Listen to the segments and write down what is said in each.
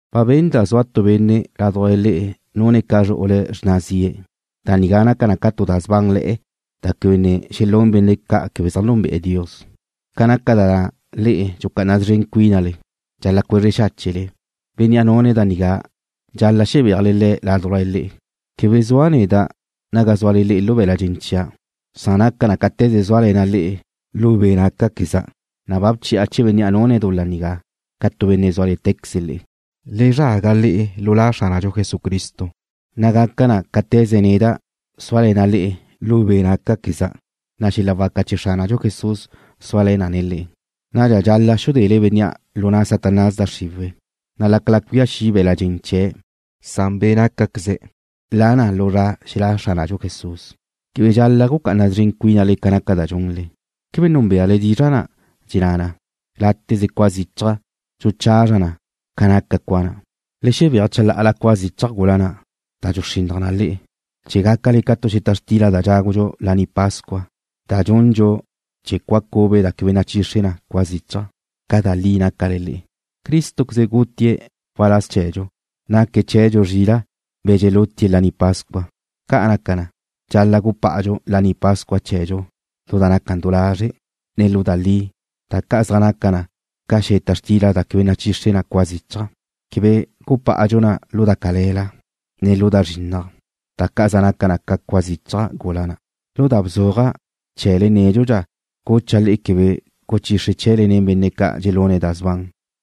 Ba benda' zua tu benne' ládujla le'e nune̱' ca zru'ule̱' xrna zie̱'. Da nigá naca na tu da sbánle̱'e̱ da quebe ne xelún benne' quebe zaj núnbe'ene̱' Dios. Ca naca da na' le'e ne dxucá'ana szren cuínale. Dxal-la' cuezre xáchele. Bénnea' nune̱' da nigá dxal-la' xebéajle le̱' ládujla le'e. Quebe zua' neda' naga zúale lu be̱la' dxen chia', san naca cáte̱ze zúale̱na' le'e lu be' nácaqueza', na' ba bchi'a chee̱ bénnea' nune̱' dul-la nigá ca tu benne' zúale̱tequeze le'e. Le zraga le'e lu La Xránadxu Jesucristo, na' gaca na cáte̱ze neda' súale̱na' le'e lu be' nácaqueza', na' xel-la waca chee̱ Xránadxu Jesús suale̱ na le'e. Nadxa dxal-la' xudele bénnea' lu na' Satanás da xriwe̱', na' lácala cuía xi' be̱la' dxen chee̱' na' be' nácaqueze̱' la na lu zra xelá' Xránadxu Jesús. Quebe dxal-la' gucá'ana szren cuínale ca naca da dxunle. ¿Quebe núnbeale dizra' na' dxenná na: Láteze cua zichaj dxuchazra na ca naca cua na'? Le xebéaj chalá'ala cua zichaj gula na' da dxuxrinnaj na le'e, chee̱ gácale ca tu xeta xtila da dxágudxu Laní Pascua, da dxundxu nen cua cube da quebe nachixre na cua zichaj, ca da li nácale le'e. Crístoqueze gutie̱' waláz chee̱dxu. Naque̱' chee̱dxu zrila', be̱ dxelutie̱' laní pascua. Ca' naca na, dxal-la' gupá'adxu Laní Pascua chee̱dxu lu da naca du lazre', ne lu da li, da ca' zaj naca na ca xeta xtila da quebe nachixre na cua zichaj. Quebe gupá'adxu na lu da cale̱la, ne lu da zrinnaj, da ca' zaj naca na ca cua zichaj gula na'. Lu da bzuaja' chee̱le nédxudxa gucha' le'e quebe guchixre chee̱le nen benne' ca' dxelune̱' da sban.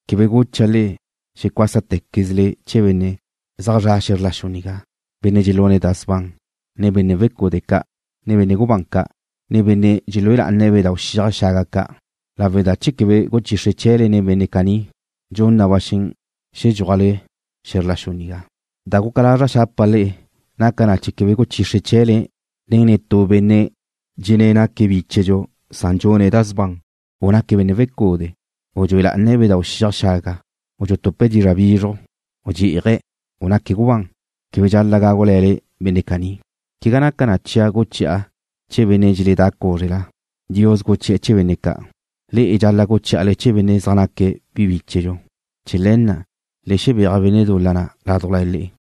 Quebe gucha' le'e xecuásatequezele chee̱ benne' zaj zre̱'e̱ xe̱zr la xu nigá, benne' dxelune̱' da sban, ne benne' wecude' ca', ne benne' gubán ca', ne benne' dxelúe lá'ane̱' bedáu' xiaj xaga ca', lawe' da chee̱ quebe guchixre chee̱le nen benne' caní, dxun na ba xen xedxúajle xe̱zr la xu nigá. Da guca lazra' xapa' le'e naca na chee̱ quebe guchixre chee̱le nen netú benne' dxenné̱' naque̱' bíchedxu, san dxune̱' da sban, u naque̱' benne' wecude', u dxue lá'ane̱' bedáu' xiaj xaga, u dxutupe̱' dizra' bizruj, u dxí'aje̱', u naque̱' gubán. Quebe dxal-la' gágule̱le benne' caní. Quegá naca chia' guchi'a chee̱ benne' dxeledá cúzrela. Dios guchi'e̱ chee̱ benne' ca'. Le'e dxal-la' guchí'ale chee̱ benne' zaj naque̱' bi bíchedxu. Chee̱ le̱ na' le xebéaj benne' dul-la na' ládujla le'e.